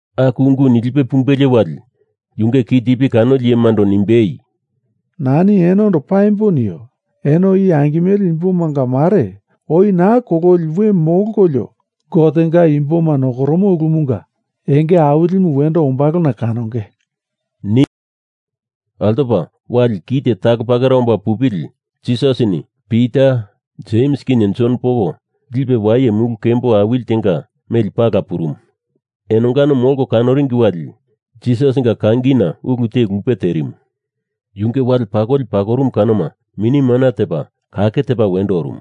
Aku ungu nilipe pumbelie wali, yunge kitipi kanoli iyemando nimbei, “Nani enondo paimbo nio. Eno i angimele imbomanga mare oi naa kololi we molkolio Gotenga imboma nokoromo ulumunga enge awilimu wendo ombalona kanonge,” nimu. Altopa wali kite talo pakera omba pupili, Jisasini Pita, Jems kinye Jon poko lipe waye mulu kembo awili tenga meli pala purumu. Enongano molko kanoringi wali, Jisasinga kangina ulu te lupe terimu. Yunge wale pakoli pakorumu kanoma mini mana tepa kake tepa wendo orumu.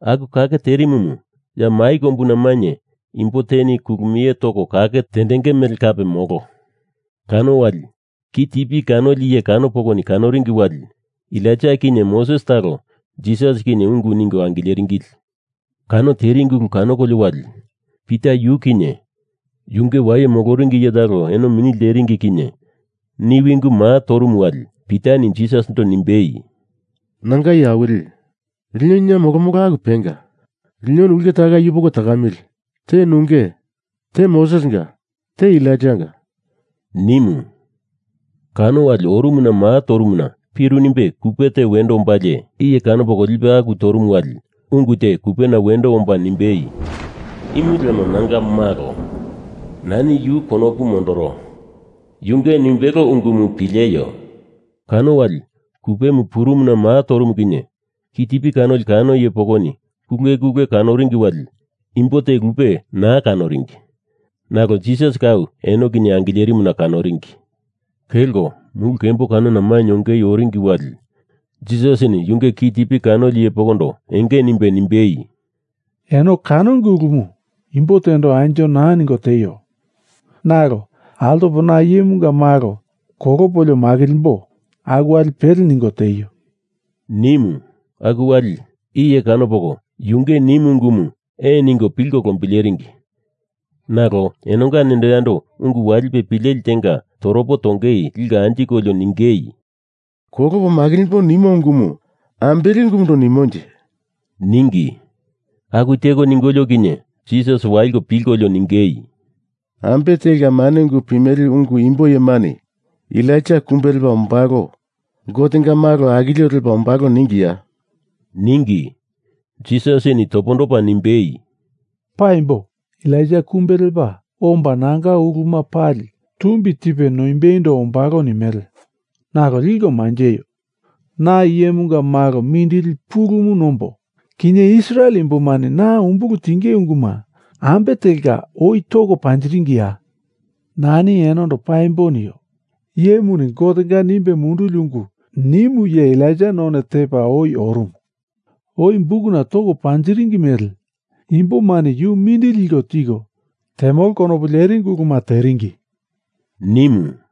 Aku kake terimumu, ya mai kombuna mainye imbo teni kulumie toko kake tendenge mele kape molo. Kano wali, kitipi kanoli iye kano pokoni kanoringi wali, Elaija kinye Moses talo Jisas kinye ungu ningo angileringili. Kano teringi ulu kanokolio wali, Pita yu kinye yunge waye moloringi iye talo eno mini lteringi kinye niwi ungumu maa torumu wali, Pitani Jisasindo nimbei, “Nanga Iye Awili, lino ina molomolo aku penga. Linoni ulke takai yupoko takamili, te nunge, te Mosesinga, te Elaijanga,” nimu. Kano wali orumuna maa torumuna piru nimbe kupe te wendo ombalie, iye kano poko lipe aku torumu wali ungu te kupena wendo omba nimbei, “Imu lemo Nanga malo. Nani yu konopu mondoro. Yunge nimbelo ungumu pileio,” nimu. Kano wali kupemu purumuna maa torumu kinye kitipi kanoli iye kano pokoni kulekule kanoringi wali imbo te lupe naa kanoringi. Nalo Jisas kau eno kinye angilerimuna kanoringi. Kelko mulu kembo kanona mainye ongei oringi wali Jisasini yunge kitipi kanoli iye pokondo enge nimbe nimbei, “Eno kanonge ulumu, imbo tendo anjo naa ningo tieio. Nalo altopo na Iyemunga Malo kolopolio makilimbo, aku wali pele ningo tieio,” nimu. Aku wali iye kano poko yunge nimu ungumu ee ningo pilko lombileringi. Nalo enonga nendo yando ungu walipe pileli tenga toropo tongei liko anjikolio ningei, “Kolopo makilimbo nimo ungumu ambele ulumundo nimonje,” ningi. Aku teko ningolio kinye, Jisas waliko pilkolio ningei, “Ambe telka mane ungu pimele ungu imbo iyemani Elaija kumbe lepa ombalo, Gotenga malo akilio lepa ombalo ningiya?” ningi. Jisasini topondopa nimbei, “Paimbo, Elaija kumbe lepa omba nanga uluma pali tumbi tipe noimbeindo ombalo nimele. Nalo liko manjeio! Na Iyemunga Malo mindili pulumu nombo kinye Israel imbomani na umbulu tinge unguma ambe telka oi toko panjiringiya? Nani enondo paimbo nio, iyemuni Gotenga nimbe munduli ungu nimu iye Elaija none tepa oi orumu. Oi bukuna toko panjiringi mele, imbomani yu mindili liko tiko temolo konopu leringi uluma teringi,” nimu.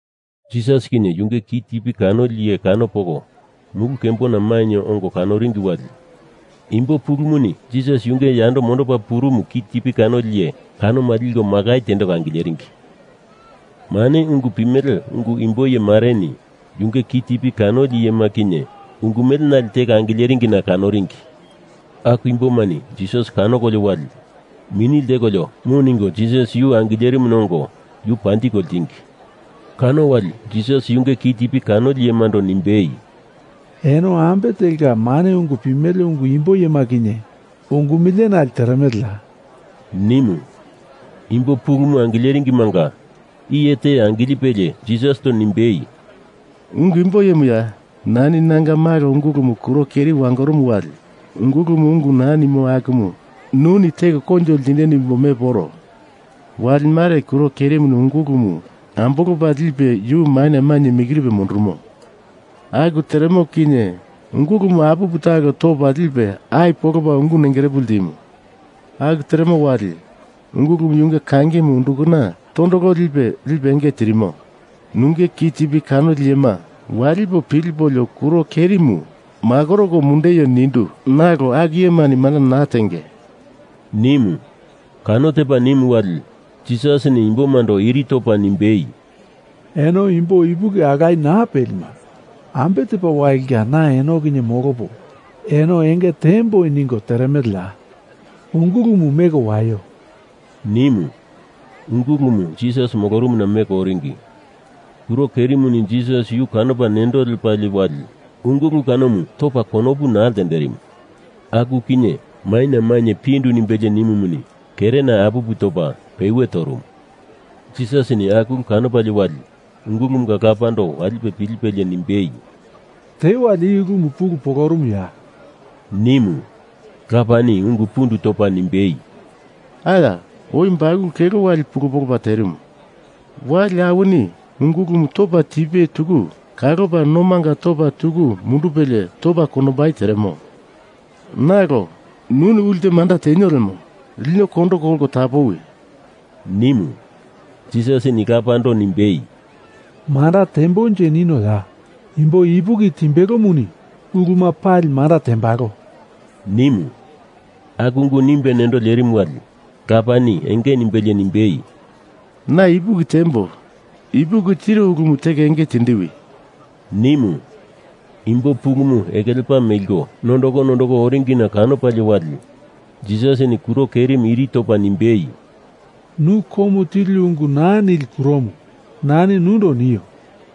Jisas kinye yunge kitipi kanoli iye kano poko mulu kembona mainye ongo kanoringi wali imbo pulumuni Jisas yunge yando mondopa purumu kitipi kanoli iye kanoma liko makai tendeko angileringi. Mane ungu pimele ungu imbo iyemareni yunge kitipi kanoli iyema kinye ungu melenale teko angileringina kanoringi. Aku imbomani Jisas kanokolio wali mini ltekolio mu ningo Jisas yu angilerimuna ongo yu panjiko ltingi. Kano wali Jisas yunge kitipi kanoli iyemando nimbei, “Eno ambe telka mane ungu pimele ungu imbo iyema kinye ungu melenale teremeleya,” nimu. Imbo pulumu angileringimanga iye te angilipelie Jisasindo nimbei, “Ungu imbo iyemuya, nani nanga malo ungulumu kuro keri wangorumu wali ungulumu ungu naa nimo akumu nuni teko koinjo ltindeni nimbo mepo oro. Wali mare, kuro kerimuni ungulumu ambolopa lipe yu maina mainye mikiripe mundurumo. Aku teremo kinye ungulumu apupu talo topa lipe ai polopa ungu nengerepu ltimu. Aku teremo wali, ungulumu yunge kangimu undukana tondolo lipe, lipe enge tirimo. Nunge kitipi kanoli iyema walipo pilipolio kuro kerimu makoroko mundeio nindu, nalo aku iyemani manda naa tendenge,” nimu. Kano tepa nimu wali, Jisasini imbomando iri topa nimbei, “Eno imbo ipuki alaye naa pelima, ambe tepa walinga na eno kinye molopo eno enge tiemboi ningo teremeleya! Ungulumu meko waio,” nimu. Ungulumu Jisas molorumuna meko oringi. Kuro kerimuni Jisas yu kanopa nendo lepalie wali, ungulu kanomu topa konopu naa ltenderimu. Aku kinye maina mainye pindu nimbelie nimumuni kerena apupu topa pewe torumu. Jisasini aku ulu kanopalie wali, ungulumunga lapando walipe pilipelie nimbei, “Tewali i ulumu pulu polorumuya?” nimu. Lapani ungu pundu topa nimbei, “Aya! Oi bakulu kelo wali pulu polopa terimu. Wali awini ungulumu topa tipena tuku kalopa nomanga topa tuku mundupelie topa kondombai teremo. Nalo, nuni ulte manda tenio lemo, lino kondo kolko tapowi,” nimu. Jisasini lapando nimbei, “Manda tembonje ninoya? Imbo ipuki timbelomuni ulu palima manda tembalo,” nimu. Aku ungumu nimbe nendo lerimu wali, lapani enge nimbelie nimbei, “Na ipuki tiembo! Ipuki tiro ulumu teko enge tindiwi,” nimu. Imbo pulumu eke lepa meliko nondoko nondoko oringina kanopalie wali Jisasini kuro kerimu iri topa nimbei, “Nu komu tili ungu naa nili kuromu, nani nundo nio,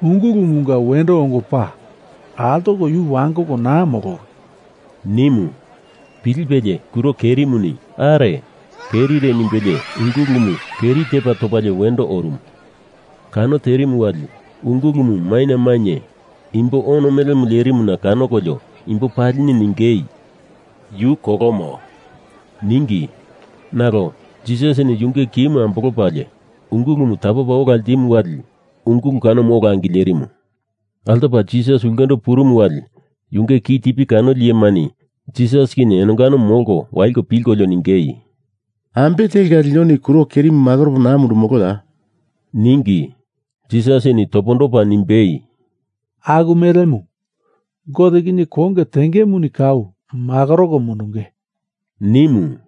ungulumunga wendo ongo pa. Altoko yu wangoko naa molowi,” nimu. Pilipelie kuro kerimuni are kerire nimbelie ungulumu keri tepa topalie wendo orumu. Kano terimu wali ungulumu maina mainye imbo ono melemu lerimuna kanokolio imbo palini ningei, “Yu kolomo,” ningi. Nalo Jisasini yunge ki ambolopalie ungulumu tapopa ola ltimu wali ungulu kanomu ola angilerimu. Altopa Jisas ulkendo purumu wali yunge kitipi kanoli iyemani Jisas kinye enongano molko waliko pilkolio ningei, “Ambe telka linoni kuro kerimu makoropo naa mundurumoloya?” ningi. Jisasini topondopa nimbei, “Aku melemu Gote kinye konge tengemuni kau makoroko mundunge,” nimu.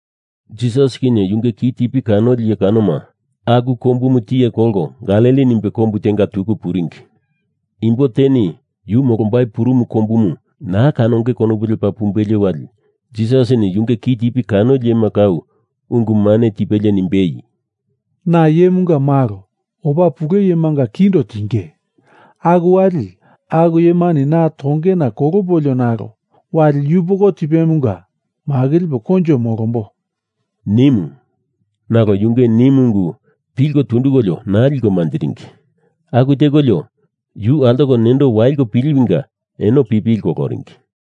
Jisas kinye yunge kitipi kanoli iye kanoma aku kombumu tiye kolko Galili nimbe kombu tenga tuku puringi. Imbo teni yu molombai purumu kombumu naa kanongei konopu lepa pumbelie wali Jisasini yunge kitipi kanoli iyema kau ungu mane tipelie nimbei, “Na Iyemunga Malo opa pule iyemanga kindo tinge. Aku wali, aku iyemani na tongena kolopolio nalo wali yupoko tipemunga makilipo koinjo molombo,” nimu. Nalo yunge nimu ungu pilko tundukolio naa liko manjiringi. Aku tekolio, yu altoko nendo waliko piliwinga, eno pipili koloringi.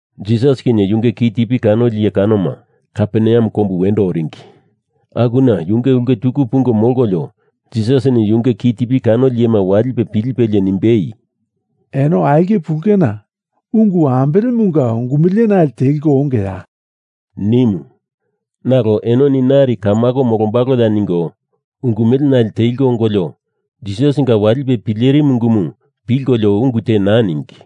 Jisas kinye yunge kitipi kanoli iye kanoma Kaperneam kombu wendo oringi. Akuna yunge ulke tuku pungo molkolio Jisasini yunge kitipi kanoli iyema walipe pilipelie nimbei, “Eno aulke pulena ungu ambelemunga ungu melenale teliko ongeya?” nimu. Nalo enoni nari kamako molombaloya ningo ungu mele nale teliko ongolio Jisasinga walipe pilerimu ungumu pilkolio ungu naa ningi.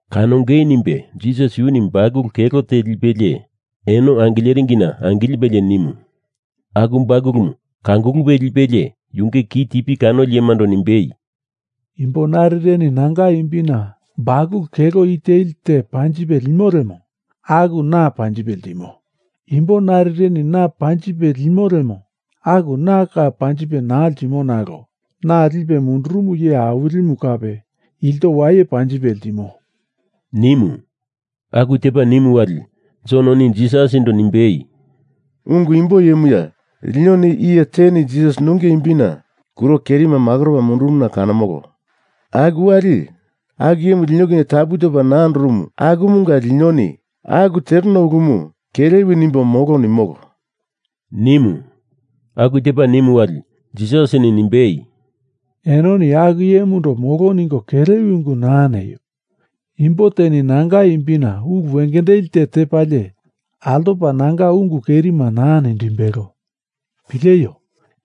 Kanongei nimbe Jisas yuni bakulu kelo te lipelie eno angileringina angilipili nimu. Aku bakulumu kangulupe lipelie yunge kitipi kanoli iyemando nimbei, “Imbo narireni nanga imbina bakulu kelo i teli te panjipe limo lemo, aku na panjipe ltimo. Imbo narireni na panjipe limo lemo, aku na kau panjipe naa ltimo nalo na lipe mundurumu iye awilimu kape ilto waye panjipe ltimo,” nimu. Aku tepa nimu wali, Jononi Jisasindo nimbei, “Ungu imbo iyemuya, linoni iye teni Jisas nunge imbina kuro kerima makoropa mundurumuna kanomolo. Aku wali, aku iyemu lino kinye tapu topa naa andorumu akumunga linoni aku tereno ulumu kelewi nimbo, molo nimolo,” nimu. Aku tepa nimu wali, Jisasini nimbei, “Enoni aku iyemundo molo ningo kelewi ungu naa neio. Imbo teni nanga imbina ulu wengendeli te tepalie, altopa nanga ungu kerima naa nindimbelo. Pileio!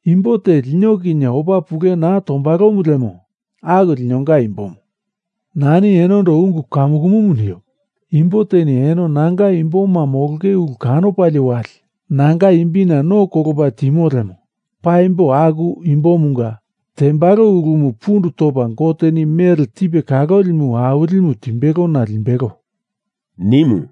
Imbo te lino kinye opa pule naa tombalomu lemo, aku linonga imbomu. Nani enondo ungu kamukumu nio. Imbo teni eno nanga imboma molonge ulu kanopalie wali nanga imbina no kolopa timo lemo paimbo aku imbomunga tembalo ulumu pundu topa Goteni mele tipe kalolimu awilimu timbelona limbelo,” nimu.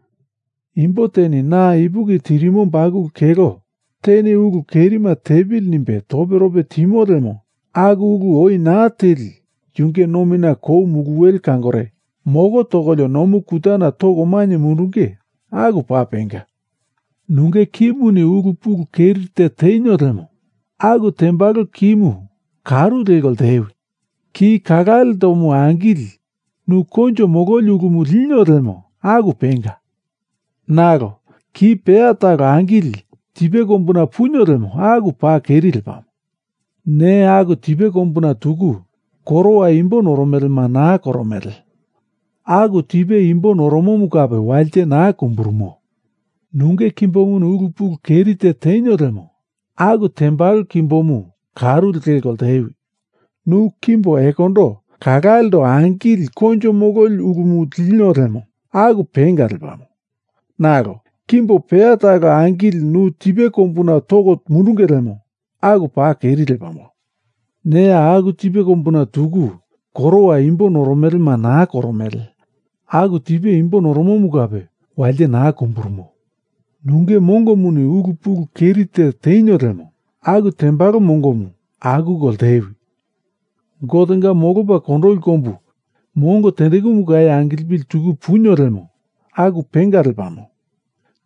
“Imbo teni na ipuki tirimo bakulu kelo teni ulu kerima tepili nimbe toperope timo lemo aku ulu oi naa teli yunge nomina kou muluwele kangore moko tokolio nomu kutana toko mainye mundunge, aku paa penga. Nunge kimuni ulu pulu keri te tenio lemo aku tembalo kimu karu leko ltewi. Ki kalalendomu angili nu koinjo mololi ulumu linio lemo aku penga. Nalo ki peya talo angili tipe kombuna punio lemo, aku paa keri lepamo. Neya aku tipe kombuna tuku korowa imbo noromelema naa koromele. Aku tipe imbo noromomu kape walite naa kumburumo. Nunge kimbomuni ulu pulu keri te tenio lemo, aku tembalo kimbomu karu leko ltewi. Nu kimbo ekondo kalalendo angili koinjo mololi ulumu linio lemo, aku penga lepamo. Nalo kimbo peya talo angili nu tipe kombuna toko mundunge lemo, aku paa keri lepamo. Neya aku tipe kombuna tuku korowa imbo noromelema naa koromele. Aku tipe imbo noromomu kape walite naa kumburumo. Nunge mongomuni ulu pulu keri te tenio lemo, aku tembalo mongomu akuko ltewi. Gotenga molopa kondoli kombu mongo tendekumu kau angilipili tuku punio lemo, aku penga lepamo.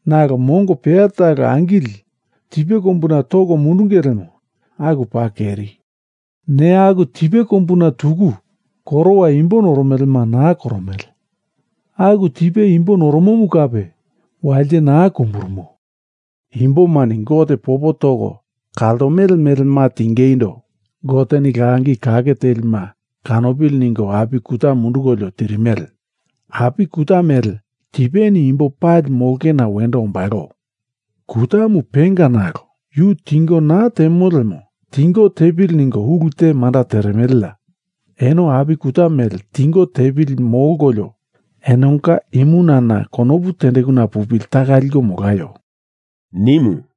Nalo mongo peya talo angili tipe kombuna toko mundunge lemo, aku paa keri. Neya aku tipe kombuna tuku korowa imbo noromelema naa koromele. Aku tipe imbo noromomu kape walite naa kumburumo. Imbomani Gote popo toko kaltomele melema tingeindo Goteni langi kake telima kanopili ningo api kuta mundukolio tirimele. Api kuta mele tipeni imbo pali molongena wendo ombalo. Kutamu penga, nalo yu tingo naa temo lemo tingo tepili ningo ulu te manda teremeleya? Eno api kuta mele tingo tepili molkolio enonga imunana konopu tendekuna pupili taka liko molaio,” nimu.